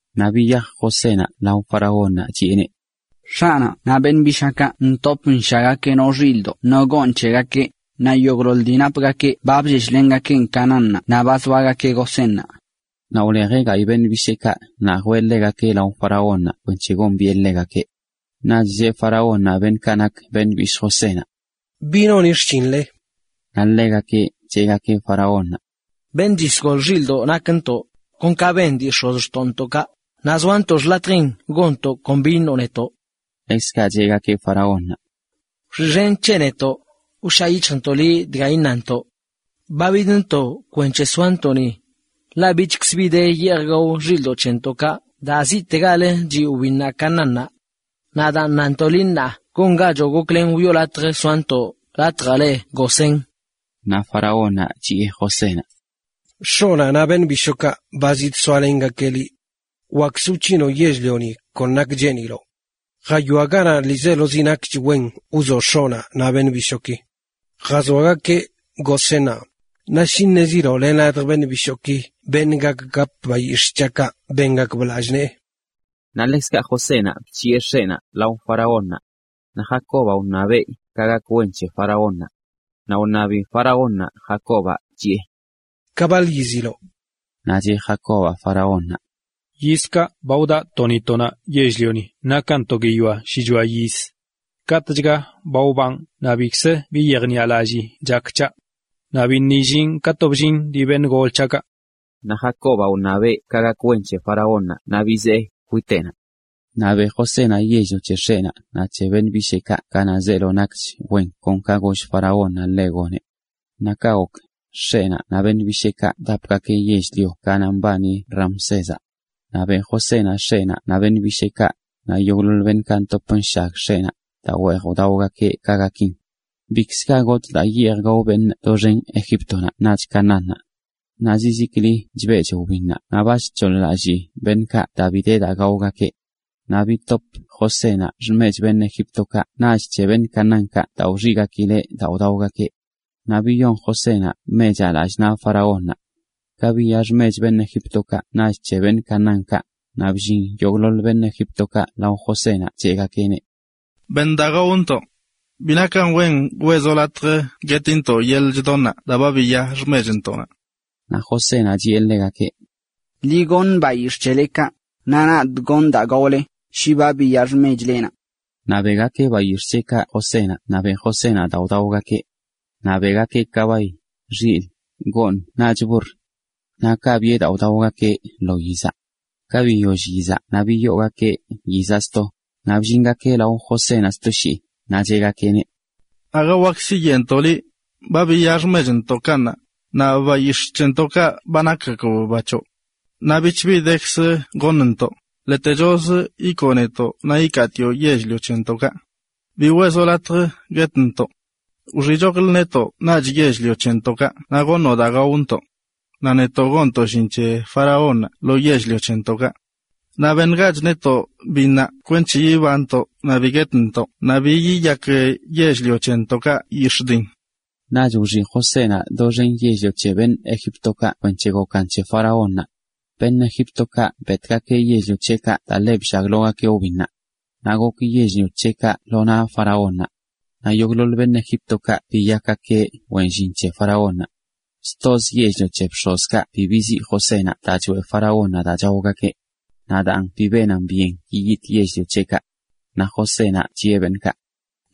Naꞌ biyaj Josénaꞌ lao faraónnaꞌ, chiꞌeneꞌ: ―X̱aꞌnaꞌ naꞌ beṉꞌ bishaakaꞌ ntop nshaggakeꞌ no xilꞌdoꞌ no gooṉ c̱hegakeꞌ, naꞌ yogꞌḻoḻ dii napgakeꞌ ba blleshlengakeꞌn Canaánnaꞌ naꞌ ba zoagakeꞌ Gosénnaꞌ. Naꞌ wlejeꞌ gayꞌ beṉꞌ bisheekaꞌ naꞌ jwee ḻegakeꞌ lao faraónnaꞌ kwenc̱he gombiꞌe ḻegakeꞌ. Naꞌch cheꞌ faraónnaꞌ beṉꞌkaꞌ nak beṉꞌ bishꞌ Josénaꞌ: ―¿Bi noni xshinle? Naꞌ ḻegakeꞌ cheꞌgakeꞌ faraónnaꞌ: ―Beṉꞌ chisgol xilꞌdoꞌ nakntoꞌ, kon ka ben dii x̱ozxtoꞌntoꞌkaꞌ, naꞌ zoantoꞌ xḻatjin gonntoꞌ kon bi iṉoꞌ netoꞌ. Ḻekzkaꞌ cheꞌgakeꞌ faraónnaꞌ: ―Wxiꞌxen c̱he netoꞌ, wshaa yic̱hjntoꞌ liꞌ dga iṉantoꞌ. Ba bidntoꞌ kwenc̱he soantoꞌ ni, ḻaꞌ bichkzə bi de yeej gao xilꞌdoꞌ c̱hentoꞌkaꞌ daa ziꞌtegalə chiꞌ wbinnaꞌ Canaánnaꞌ. Naꞌ daan nantoꞌ liꞌ ṉaa, gongachoꞌ goklen wiꞌo latj soantoꞌ latjaꞌ le Gosén. Naꞌ faraónnaꞌ chiꞌe Josénaꞌ: ―X̱oꞌnaꞌ naꞌch beṉꞌ bishookaꞌ ba zidsoalengakeꞌ liꞌ. Wakzə wc̱hinoꞌ yell-lioni ka cheeniloꞌ. Jawia ganaꞌ ḻiizelozi nakch wzoꞌ x̱oꞌnaꞌ naꞌ beṉꞌ bishooki. Jazoagakeꞌ Gosénnaꞌ, naꞌ shi ṉeziloꞌ len ladj beṉꞌ bishooki beṉꞌ wak gap bayix̱ꞌ c̱haꞌkaꞌ, bengakb lallꞌ nee. Naꞌ ḻekzkaꞌ Josénaꞌ bc̱hiꞌe x̱eꞌnaꞌ lao faraónnaꞌ. Naꞌ Jacobaꞌ wṉabeꞌ ka gak wen c̱he faraónnaꞌ. Naꞌ wṉabi faraónnaꞌ Jacobaꞌ, chiꞌe: ―¿Ka baḻ yiziloꞌ? Naꞌ cheꞌ Jacobaꞌ faraónnaꞌ: ―Yizkaꞌ ba wdaꞌ to ni to naꞌ yell-lioni nakan to guiyoa shichoa yiz. Katꞌchga ba wbanꞌ naꞌ bikzə bi yejniꞌalallii chak c̱haꞌ. Naꞌ biṉꞌ illinꞌ ka to bllin dii beṉꞌ gol c̱haꞌkaꞌ. Naꞌ Jacobaꞌ wṉabeꞌ ka gak wen c̱he faraónnaꞌ naꞌ bizee kwiteꞌnaꞌ. Naꞌ beꞌ Josénaꞌ yell-lio c̱he x̱eꞌnaꞌ naꞌ c̱he beṉꞌ bisheekaꞌ ganaꞌ zeelo nakch wen kon ka goll faraónnaꞌ ḻeꞌ goneꞌ. Naꞌ kaꞌ gok, x̱eꞌnaꞌ naꞌ beṉꞌ bisheekaꞌ wdapgakeꞌ yell-lio ganaꞌ mbani Ramsézaꞌ. Naꞌ beꞌ Josénaꞌ x̱eꞌnaꞌ naꞌ beṉꞌ bisheekaꞌ, naꞌ yogꞌḻoḻ beṉꞌkaꞌ ntop nshag x̱eꞌnaꞌ, daa weej wdaogakeꞌ ka gakin. Bikzə ga gotꞌ daa yeej gao beṉꞌ doxen Egíptonaꞌ naꞌch Canaánnaꞌ. Naꞌ zizikli chbeꞌch wbinnaꞌ naꞌ ba chc̱hoḻ-lallii beṉꞌkaꞌ daa bi de daa gaogakeꞌ. Naꞌ bitop Josénaꞌ xmech beṉꞌ Egíptokaꞌ naꞌch c̱he beṉꞌ Canaánkaꞌ daa wxiꞌgakileꞌ daa wdaogakeꞌ. Naꞌ biyon() Josénaꞌ mechaꞌ lallꞌ naꞌ faraónnaꞌ. Ka biya xmech beṉꞌ Egíptokaꞌ naꞌch c̱he beṉꞌ Canaánkaꞌ, naꞌ bllin yogꞌḻoḻ beṉꞌ Egíptokaꞌ lao Josénaꞌ cheꞌgakeꞌneꞌ: ―Beṉ daa gaontoꞌ. Bi nakan wen weꞌzoꞌ latj guetintoꞌ yeḻꞌ chdonnaꞌ daa ba biya xmechntoꞌnaꞌ. Naꞌ Josénaꞌ chiꞌe ḻegakeꞌ: ―Ḻi goṉ bayix̱ꞌ c̱helekaꞌ, naꞌ nadꞌ gonꞌ daa gaole, shi ba biya xmechlenaꞌ. Naꞌ beꞌgakeꞌ bayix̱ꞌ c̱heꞌkaꞌ Josénaꞌ, naꞌ beꞌ Josénaꞌ daa wdaogakeꞌ. Naꞌ beꞌgakeꞌ kabay, xilꞌ, gooṉ naꞌch burr, naꞌ biꞌe daa wdaogakeꞌ lo yizaꞌ. Ka biyoll yizaꞌ naꞌ biyoogakeꞌ yizaꞌ sto, naꞌ bllingakeꞌ lao Josénaꞌ sto shii, naꞌ cheꞌgakeꞌneꞌ: ―Aga wak siyeꞌntoꞌ liꞌ, ba biya xmechntoꞌkaꞌ ṉaa, naꞌ bayix̱ꞌ c̱hentoꞌkaꞌ ba nakgakb ba c̱hoꞌ. Naꞌ bich bi dekzə goṉntoꞌ, ḻetechozə ikoo netoꞌ naꞌ ikaatioꞌ yell-lio c̱hentoꞌkaꞌ. Bi weꞌzoꞌ latj guetntoꞌ. Wxiꞌchoklə netoꞌ naꞌch yell-lio c̱hentoꞌkaꞌ naꞌ goṉoꞌ daa gaontoꞌ naꞌ netoꞌ gonntoꞌ llin c̱he faraónnaꞌ lo yell-lio c̱hentoꞌkaꞌ. Naꞌ beṉgach netoꞌ biṉnaꞌ gazntoꞌ kwenc̱he bi guetntoꞌ naꞌ bi yiyak yell-lio c̱hentoꞌkaꞌ yix̱ꞌ diṉ. Naꞌch wxiꞌ Josénaꞌ doxen yell-lio c̱he beṉꞌ Egíptokaꞌ kwenc̱he gokan c̱he faraónnaꞌ. Beṉꞌ Egíptokaꞌ betgakeꞌ yell-lio c̱heꞌkaꞌ daa ḻe bllaglogakeꞌ wbinnaꞌ. Naꞌ gok yell-lio c̱heꞌkaꞌ lo naꞌ faraónnaꞌ. Naꞌ yogꞌḻoḻ beṉꞌ Egíptokaꞌ biyakgakeꞌ wen llin c̱he faraónnaꞌ. Stozə yell-lio c̱he bx̱ozkaꞌ bi biziꞌ Josénaꞌ daa choeꞌ faraónnaꞌ daa chaogakeꞌ. Naꞌ daan bi benan byen yiyitꞌ yell-lio c̱heꞌkaꞌ. Naꞌ Josénaꞌ chiꞌe beṉꞌkaꞌ: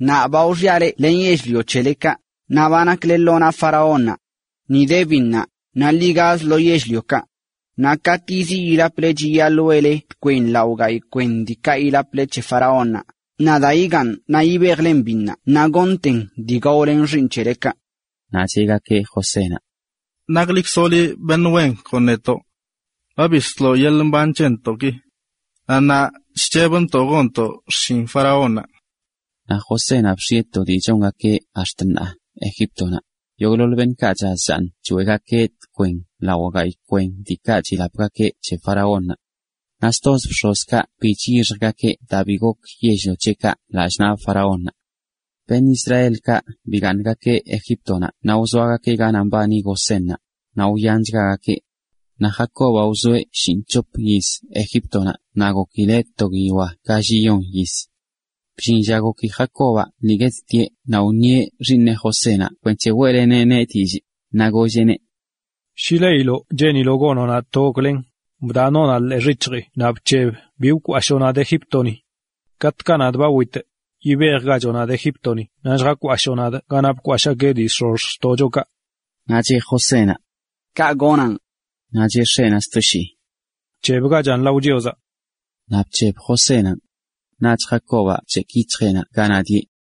―Ṉaa ba wxiꞌa leꞌ len yell-lio c̱helekaꞌ, naꞌ ba nakle lo naꞌ faraónnaꞌ. Ni de biṉnaꞌ; ḻi gaz lo yell-liokaꞌ. Naꞌ katꞌ yiziꞌ yilaple chiyaḻꞌ weꞌle tkwen lao gayꞌ kwen diikaꞌ yilaple c̱he faraónnaꞌ, naꞌ daa yigaaṉ naꞌ yibejle biṉnaꞌ naꞌ goṉten dii gaolen xiiṉ c̱helekaꞌ. Naꞌ cheꞌgakeꞌ Josénaꞌ: ―Naklikzoꞌ liꞌ beṉꞌ wen kon netoꞌ. Ba bisloꞌ yeḻꞌ mban c̱hentoꞌki. Naꞌ ṉaa chc̱hebntoꞌ gonntoꞌ xshin faraónnaꞌ. Naꞌ Josénaꞌ bx̱ieꞌ Egíptonaꞌ to dii chongakeꞌ ax̱t ṉaa: yogꞌḻoḻ beṉꞌkaꞌ chaz chaaṉ choeꞌgakeꞌ tkwen lao gayꞌ kwen diikaꞌ chilapgakeꞌ c̱he faraónnaꞌ. Naꞌ stozə bx̱ozkaꞌ bi chyixjgakeꞌ daa bi gok yell-lio c̱heꞌkaꞌ lallꞌ naꞌ faraónnaꞌ. Beṉꞌ Israelkaꞌ bigaaṉgakeꞌ Egíptonaꞌ naꞌ wzoagakeꞌ ganaꞌ mbani Gosénnaꞌ, naꞌ wyanchgagakeꞌ. Naꞌ Jacobaꞌ wzoeꞌ shinꞌc̱hop yiz Egíptonaꞌ naꞌ gokileꞌ to guiyoa galliyon yiz. Bllin lla goki Jacobaꞌ lii guettieꞌ naꞌ wṉieꞌ xiiṉeꞌ Josénaꞌ kwenc̱he weꞌleneꞌneꞌ dillꞌ, naꞌ golleꞌneꞌ: ―Shi leiloꞌ cheeniloꞌ gonoꞌ nadꞌ to goklen, bdaꞌ takooꞌnaꞌ ḻee xic̱hjii naꞌ bc̱heb bi wkwashoo nadꞌ Egíptoni. Katꞌkaꞌ nadꞌ ba witꞌ, yibejgachoꞌ nadꞌ Egíptoni naꞌ lljakwashoo nadꞌ ganaꞌ bkwashꞌgakeꞌ dii x̱ozxtoꞌchokaꞌ. Naꞌ cheꞌ Josénaꞌ: ―Kaꞌ gonaꞌn. Naꞌ cheꞌ x̱eꞌnaꞌ sto shii: ―Bc̱hebgachan lao Chiozaꞌ. Naꞌ bc̱heb Josénaꞌn. Naꞌch Jacobaꞌ bc̱hekꞌ yic̱hjeꞌnaꞌ ganaꞌ dieꞌ.